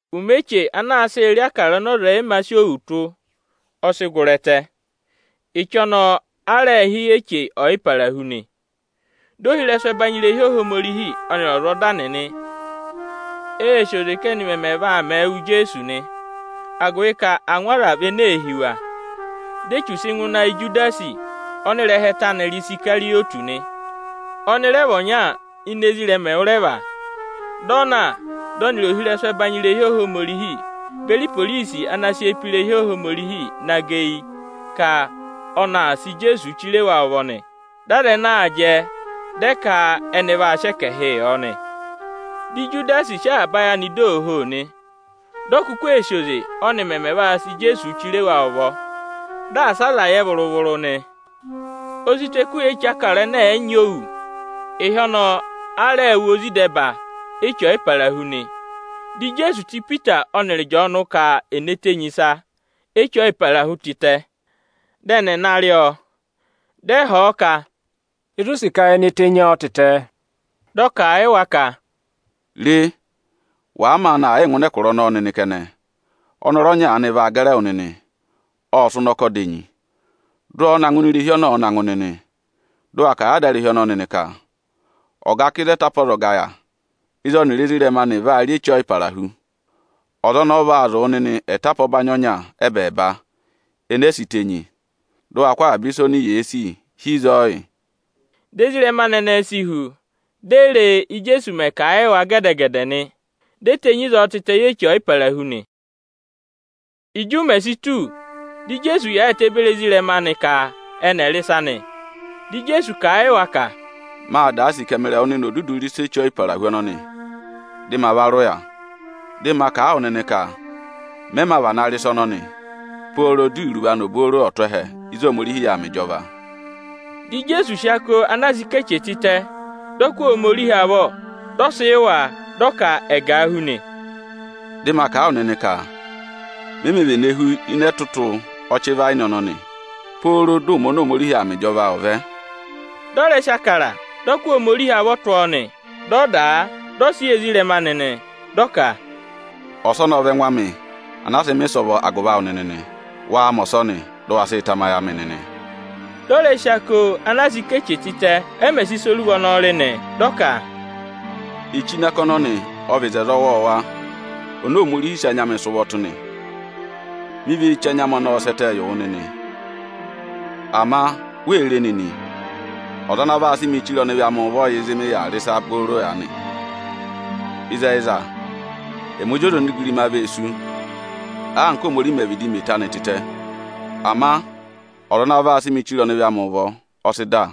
Ụmẹ eche ana a sịị̄ rị Ịbụrẹẹdị ọnị ọza ọ̀ yị mā sị òwù tụ́, ọ sị gụrị ẹtẹ. Eche ọnọọ a rẹẹ̄ hị́ Eche Ọyịparahu nị. Dị ohirẹsụ ẹbanyị irehi Ohomorihi ọnịrị ọzwọzọda nịnị ee sì oze ka ẹ́nị mẹmẹ vaa mẹẹ wụ Ijeesu nị, agụvị ka angwa aza vị ene ee hí wa. Di Echu sị ngụ ịnị ayị Ijudasi ọnị ịrẹha ẹtẹ anị rị Isikarịyọtị nị. Ọnị rẹ vị ọnya ini ezirẹma ẹwụrẹva. Dị ọ na, dị ọnịrị ohirẹsụ ẹbanyị irehi Ohomorihi beri iporisi ana sị eyi pe irehi Ohomorihi na gẹ eyi ka ọnị aa sị Ijeesuu chire wa ụvọ nị. Dị aza ẹnẹẹ aa jẹ, dị ẹ ka ẹnị vaa sị ẹkẹhịị yọ nị. Dị Ijudasi sị avaba ayị anị dọ ooho nị. Di o kuku ee sì oze, ọ́ nị mẹmẹ vaa sị Ijeesuu chire wa ụvọ, dị asị aza yẹ vụrụ-vụrụ nị. O si tù ẹkụhị Eche Ịbụrẹẹdị ẹnẹ ẹ̀ yị nyị òwù. Ịhị ọnọọ a rẹẹ̄ wụ ozi ịdẹba Eche Ọyịparahu nị. Dị Ijeesu tụ́ Ipita ọnịrị Ịjọọnụ kà è ne tenyi ịsa Eche Ọyịparahu tịtẹ, dị ẹnị ẹ̀ na rị ọ nị. Dị ẹ họ̀ ọ ka, “Ịzị u sì ka ye ne tenyi ọọ tịtẹ?” Dị ọ kà a yị wa ka, “Re! Wàa maanị aa yịị ngụ ịnị ẹkụra ọnọọ nịnị kẹnẹ, ụ vaa gẹrị ọnọrụ ọnya aanị nịnị; ộ sị ụnọkọ dà enyi. Dụ ọọ na ngụ ini irehi ọnị ọ̀ọ na ngụ nịnị! Dị ụ wa kà a yị adarehi ọnọọ nịnị ka: ‘Ọga ka ịzị ẹtapa ọzọga yà, ịzị ọnịrị ezirẹma anị vaa rị Eche Ọyịpara hu?’ Ọza ọnọọ vaa zụ̀ wụ nịnị ẹtapa ọbanyị ọnya ẹ́bẹẹba, ene e si tenyi, dị ụ wa kụ́ avaba ịsa oni yee sì hi ịzọọ yị!” Dị ezirẹma anị ẹnẹẹ si hu, di e re e, Íjeesu mẹ̀ yị kà a yị wa gẹdẹ-gẹdẹ nị. Di e tenyi ịzọọ tịtẹ yị Eche Ọyịparahu nị. Ịjị ụmẹ si tù, dị Ijeesu yaayịtẹ beri ezirẹma anị ka ẹnị ẹ̀ rị ịsa nị. Dị Ijeesu kà a yị wa ka, “Mâ da sì ka ẹmịrị ẹwụ nịnị ò dudu rị ịsa Eche Ọyịparahu ọnọnị, dị ma va rị ụya. Dị ma kà a wụ nịnị ka mẹ mā vana rị ịsa ọnọnị, pooro di iruvo anị obooro ọ̀ tụ́ ẹhẹ ịzị Ohomorihi yà aa mẹ ịjọva.” Dị Ijeesu sị ako ana a sị ká eche tịtẹ, dị ọ kụ́ Ohomorihi avọ, dị ọ sị yị wa, dị ọ ka ẹ̀ gà a hú nị: “Dị ma kà a wụ nịnị ka, me mē vene hú ịnị ẹtụtụ ọchị ịvayịnị ọnọnị, pooro dị ụmẹ oni Ohomorihi aa mẹ ịjọva ọ̀ vẹ.” [Dị ọ rẹ sị Ịbụrẹẹdị, dị ọ kụ́ Ohomorihi avọ tụ́ ọọ nị. Dị ọ dà a, dị ọ sị yị ezirẹma anị nị. Dị ọ ka, “Ọsọnị ọ vị ẹngụ amị ana a sị mẹ̀ ịsọvọ agụvị awụ nịnị nị. Waa mẹ ọsọnị, dị ụ wa sịị tamayị amị nịnị!” Dị ọ rẹ sị ako ana a sị ká eche tịtẹ, ẹ mẹ̀ sị ịsa oruva ọnọọ rị nị. Dị ọ ka, “Eche ini ako ọnọnị ọ vị oto ọwọọwa oni Ohomorihi sị anya amị sị ụvọ tụ́ nị. Mi vee che anya amị ọnọọ sẹ́ ẹtẹ yị wụ nịnị.] Ama, re nịnị! Ọza ana vaa sị mịị chire ọnịvị amị ụvọ yà ịzị mị yà aa rị ịsa booro aanị. Ịzẹyịza ẹmị Ozi ọza onigirima vee sú, anka Óhomorihi mẹ̀ vịdị mẹ eto anị tịtẹ; ama ọza ana vaa sị mịị chire ọnịvị amị ụvọ, ọ sị dà.”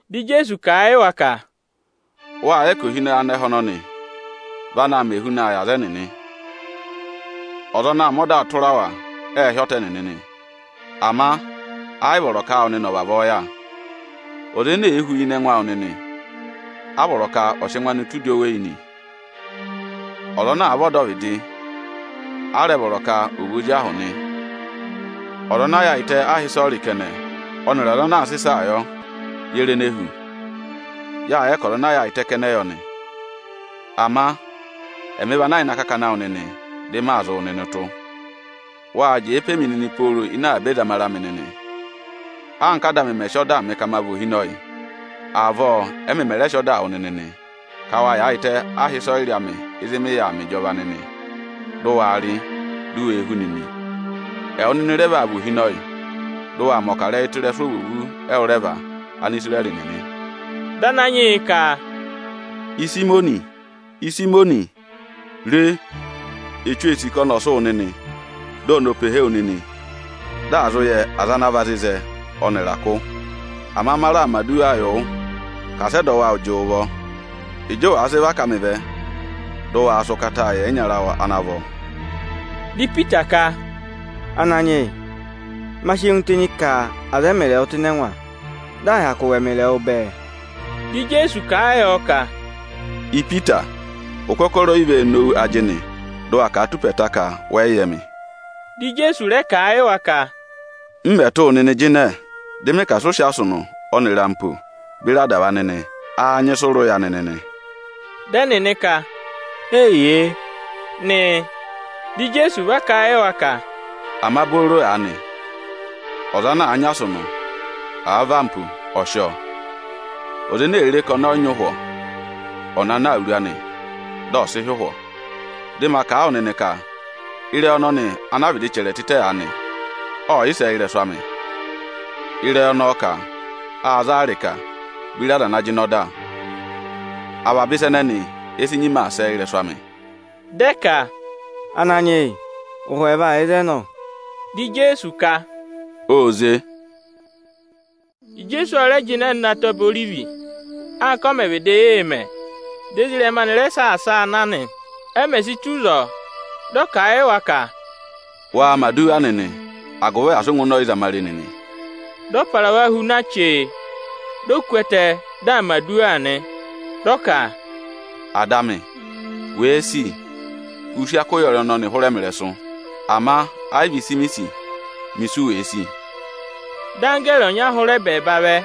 Dị Ijeesu kà a yị wa ka, “Wâ yẹ ka ohinọyị anẹhẹ ọnọnị vị anaā mẹ ehunaa yị aza ẹnịnị. Ọza ana aa mẹ ọda tụra wa, ẹẹ̄ hị́ ọta ẹnịnị nị. Ama ẹ yị vọrọ ka áawụ nịnị ọ̀ vavọọ yà. Ọza ene èe hu ịnị ẹngụ awụ nịnị, a vọrọ ka ọ̀ sị ẹngụ anị tụ́ udi oweyi nị. Ọza ana àa vị ọdọvịdị, ọ̀ọ mẹ̀ ebira ozi ahụ. Ọza ana yaayịtẹ aha ịsọyịrị kẹnẹ ọnịrị ọza ana aa sị ịsaa yọ, ye re ene hu? Yâ yẹ ka ọza ana yaayịtẹ kẹnẹ yọ nị. Ama ẹmị vị ana yà ịnị akakana awụ nịnị, dị maa zị wụ nịnị ụtụ. “Wá raa jẹẹ pe mi nịnị pooro ịnị avaba ẹzamare amị nịnị. Anka Áda amị mẹ̀ sị ọdaa mị ka ma vị ohinọyị, avọọ ẹ́mị mẹ̀ rẹ sị ọdaa wụ nịnị nị, ka wa yaayịtẹ aha ịsọyịrị amị ịzị mị yà aa mẹ ịjọva nịnị, dị ụ waa rị, di u wee hú nịnị. Ẹwụ nịnị rẹ vaa vị ohinọyị, dị ụ waa mẹ̀ ọkarẹyị tụ́ ịrẹsụ ovwoovu ẹwụrẹva Anisirẹrị nịnị.” Dị Ananyị yị ka, “Ịsayịmọnị, Ịsayịmọnị! Re, Echu ee sì ka ọnị ọ̀ sị wụ nịnị, di oni ò pehe wu nịnị, dị à zụ yẹ aza ana vị azịzẹ ọnịrị akụ. Ama ma raà mẹ̀ aduwa yị wụ ka asị ẹdọwụ awụ jị wụ ụvọ. Ịjị ụ wàa sị và ká mị vẹ, dị ụ waa sị ụkataa yị ẹyịnyara awụ ana vọ!” Dị Ipita ka, “Ananyị yị, ma sị ẹngụ tenyi ka à za ẹmịrị ẹwụ tụ́ ịnị ẹngwa, dị à hyakụ wụ ẹmịrị ẹwụ bẹẹ.” Dị Ijeesu kà a yọ ka, “Ipita, ụkọkọrọ o yi vee nowu ajịnị, dị ụ wa kà a tù ụpẹ ẹẹta ka wẹ yị yẹ mị.” Dị Ijeesu rẹ kà a yị wa ka, “M mẹ̀ tụ́ wụ nịnị jịnẹ, dị mị ka asị ụ sị asụnụ ọnịrị ampo beri adava nịnị, áá nyị ịsị ụ rị ụya anị nịnị?” Dị ẹnịnị ka, “Eyiye” nị. Dị Ijeesu va kà a yị wa ka, “Ama booro aanị, ọza ana àa nyị asụnụ, àa vị ampo, ọ̀ sị ọọ! Ọza ene èe re ka ọnị ọ yị nyị ụhwọ, ọ̀ na ná awuru anị, dị ọ̀ sị hị́ ụhwọ.” Dị ma kà a wụ nịnị ka â nyị ka ịrẹyị ọnọnị ana a vịdị chẹrẹ tịtẹ aanị, ọ̀ sẹ ị́rẹsụ amị. Ịrẹyị ọnọọ ka: “Â za a ịrịka beri aza ana jịnẹ ọda. Avaba ịsa ẹnẹnị e si nyima aa sẹ ị́rẹsụ amị.” Dị ẹ ka, “Ananyị yị ụhwọ ẹẹva yà ịzẹnị, ọ!” Dị Ijeesu ka, “Ô ze.” Ijeesu ọ rẹ jịnẹ nọ ịnị Ataba Orivi, anka ọ mẹ̀ vịdị yị mẹ; dị ezirẹma anị rẹ saasa a na nị. E mè si tù ịzọọ, dị ọ kà a yị wa ka, “Waa mẹ̀ aduwa nịnị, agụvị asị ụ ngụ ịnị ọyịzamare nịnị!” Dị ọ para wa hu na chee, di o ku ẹtẹ, dị aa mẹ̀ aduwa nị. Dị ọ ka, “Ada amị, wèe sì, ụ sị ako ụyọrị ọnọnị hụrẹ mị ịrẹsụ. Ama ẹ yị vị ịsị mi sì, mẹ ịsị u wèe sì!” [Dị anggẹẹrị ọnya hụrẹ ẹbẹẹba vẹ,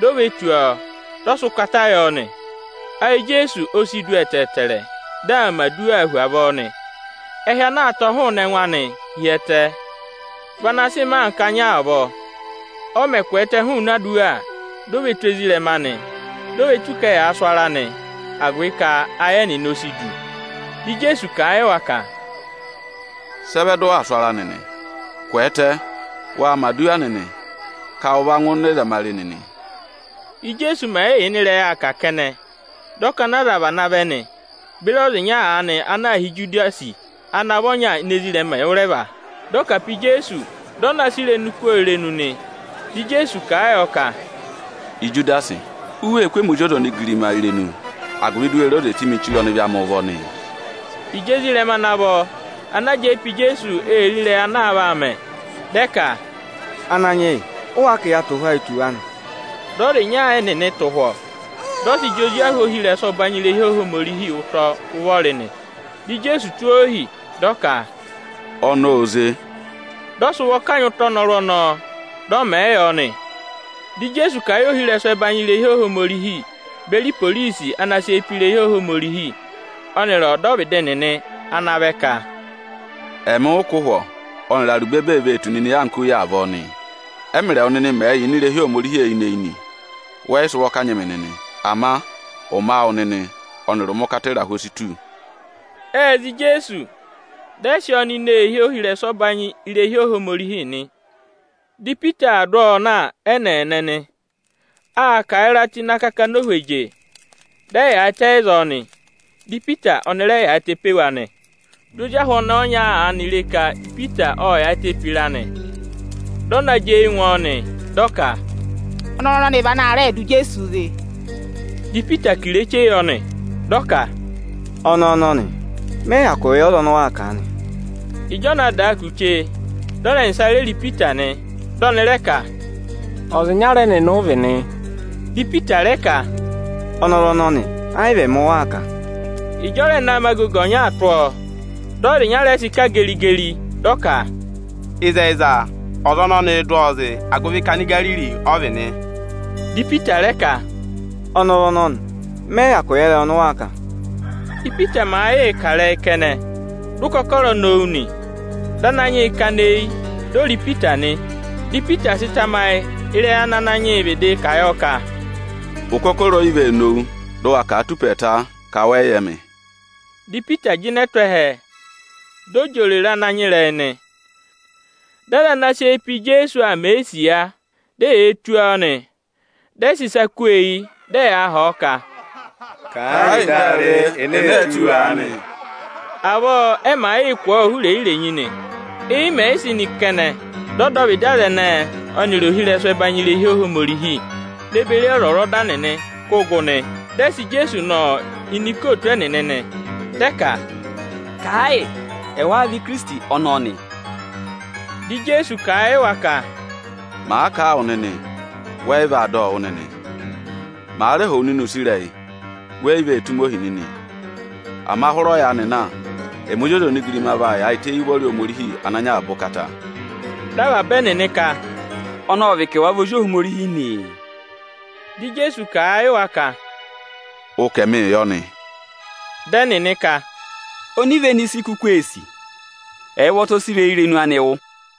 di o ve tù ọọ, dị ọ sị ụkata yọ nị. Ayị Ijeesu o si du ẹtẹẹtẹrẹ, dị aa mẹ̀ aduwa hu avọọ nị. Ẹhị ana aa tọ̀ hụụnị ẹngụ anịị hi ẹtẹ vị ana sị mẹẹ anka anya avọọ.] Ọ mẹ̀ kwẹẹtẹ hụụnị aduwa, di o ve tù ezirẹma anị, di o ve tù ka ẹyaa sụ ara nị, agụvị ka ayị ẹnịnị o si du. Dị Ijeesu kà a yị wa ka, “Sị ẹ vẹ dị ụ waa sụ ara nịnị? Kwẹẹtẹ, wa mẹ̀ aduwa nịnị ka ụ va ngụ ịnị ẹzamare nịnị!” Íjeesu mẹ̀ yị yà ịnị ịrẹyị aa kà kẹnẹ, dị ọkọnị aza vana vẹ nị, beri ọza ịnya aanị ana aā hị́ Ijudasi, ana vị ọnya ini ezirẹma ẹwụrẹva. Dị ọ kà pe Ijeesu, ka oni ò kú ọ irenu nị; Dị Ijeesu kà a yọ ka, “Ijudasi, wee kú emi Ozi ọza onigirima irenu, agụvị di u we re oze sị mị chire ọnịvị amị ụvọ nịị?” Ịjị ezirẹma ana vọ ana jẹẹ pe Ijeesu ee re ịrẹyị ana aa vaa mẹ, dị ẹ ka, “Ananyị yị ụ wáá ka ya tụ̀ ụhwọ ayị tù wa nị?” Dị ọza ịnya ẹnịnị tụ̀ ụhwọ, dị ọ sị jị ozi ahụ ohirẹsụ ọbanyị irehi Ohomorihi ụtọ ụvọrị nị. Dị Ijeesu tụ́ ohi, dị ọ ka, “Ọnọọ ô ze!” Dị ọ sị ụvọ kanyị ụtọ ọnọrụ ọnọọ, dị ọ mẹ̀ ẹ yọ nị. Dị Ijeesu kà a yị ohirẹsụ ẹbanyị irehi Ohomorihi beri iporisi ana sị eyi pe irehi Ohomorihi, ọnịrị ọdọvịdị nịnị ana vẹ ka, “Ẹmị ụ kụ́ ụhwọ ọnịrị arubebe ee vee tù nịnị anka oyi avọọ nịị! Ẹ́mị rị ẹwụ nịnị mẹ̀ẹ̄ yà ini irehi Ohomorihi eyinị-eyinị, wẹ yị sị ụvọ kanyị mị nịnị. Ama ụmẹ awụ nịnị ọnịrị ụmẹ ụkata ịrahụ o si tù.” Ệ za Ijeesu, dị ẹ sị ọọ nọ ini eehi ohirẹsụ ọbanyị irehi Ohomorihi nị. Dị Ipita aa dụ ọọ na ẹ́nẹẹnẹ nị. Â kà ịra tụ́ ịnị akakana ohweje, dị ẹ yaayịtẹ ịzọọ nị. Dị Ipita ọnị rẹ yaayịtẹ pe wa nị. Di ozi ahụ ọnẹẹ ọnya aanị re ka Ipita ộ yaayịtẹ pe ịra nị. Dị ọ na jị eyi ngụ ọọ, dị ọ ka, “Ọnọrụ ọnọnị vị ana rẹẹ̄ dụ Ijeesuu zị.” Dị Ipita ka ireche yọ nị. Ọ kà, “Ọnẹẹ ọnọnị, mẹ yị hyakụ yẹ ọza ọnị ụ waa kà aanị.” Ịjị ọ naa daa kù chee, ọza ẹnẹsa ô re re Ipita, dị ọnị rẹ ka, “Ọza ịnyara ẹnịnị ụ vị nị.” Dị Ipita rẹ ka, “Ọnọrụ ọnọnị, ẹ yị vị ẹmị ụ waa kà.” Ịjị ọ rẹ naa mẹ agogo ọnyaa tụ́ ọọ, dị ọza ịnya rẹ sị kà geri-geri, dị ọ ka, “Ịzẹyịza, ọza ọnọnịị̄ dụ ọọ zị, agụvị ka Anigariri ọ vị nị.” Dị Ipita rẹ ka, “Ọnọrụ ọnọnị, mẹ yị hyakụ yẹ ịrẹyị ọnị ụ waa kà aanị.” Ípita màa yịị kà ịrẹyị kẹnẹ, dị ụkọkọrọ nowu nị. Dị Ananyị yị kana eyi, di o re Ipita nị. Di Ipita sị tamayị ịrẹyị ana Ananyị yị vịdị kà yọ ka, “Ụkọkọrọ o yi vee nowu, dị ụ wa kà a tụ́ ụpẹ ẹẹta ka wẹ yị yẹ mị.” Di Ipita jịnẹ tụ́ ẹhẹ, dị ọ jị òrèrè ana nyị ịrẹyị nị. Dị aza ana sị eyi pe Ijeesu aa mẹ̀ ẹ isiya, di eyee tụ́ ọọ nị. Dị ẹ sị ịsa kú ọọ eyi, dị ẹyaa họ̀ ọ ka, “Kà ẹ yị di a re ene ee tụ́ wu aanị?” Avọọ ẹ màa yịị kụ̀ ọọ ụhụ irenyi-irenyi nị. Éyi mẹ̀ yị sị nị kẹnẹ, dị ọdọvịdị aza ẹnẹẹ ọnịrị ohirẹsụ ẹbanyị irehi Ohomorihi ne beri ọzwọzọda nịnị kụ́ gụ nị, dị ẹ sị Ijeesu nọ ini ikootu ẹnịnị nị. Dị ẹ ka: “Kà ẹ yị, ẹwáá vị Ikirisiti ọnọọ nị?” Dị Ijeesu kà a yị wa ka: “Màa kà a wụ nịnị, wẹ yị vaa dọ ọ wụ́ nịnị. Màa rẹ họ̀ wụ nịnị use ịrẹyị, we yi vee tụ́ ohi nịnị. Ama hụrẹ ọyaanị na, ẹmị Ozi ọza onigirima vaa yaayịtẹ éyi ụvọrị Ohomorihi Ochẹtẹngụ.” Dị avaba ẹnịnị ka, “Ọnị ọ vị ka ẹwa vị Ozi Ohomorihi nịị?” Dị Ijeesu kà a yị wa ka, “Ụ ka ẹmịị yọ nị.” Dị ẹnịnị ka, “Onivenu ịsị i kuku ee sì? Ẹ yị ụvọta ọ sị ịrẹyị irenu anị wụ́.”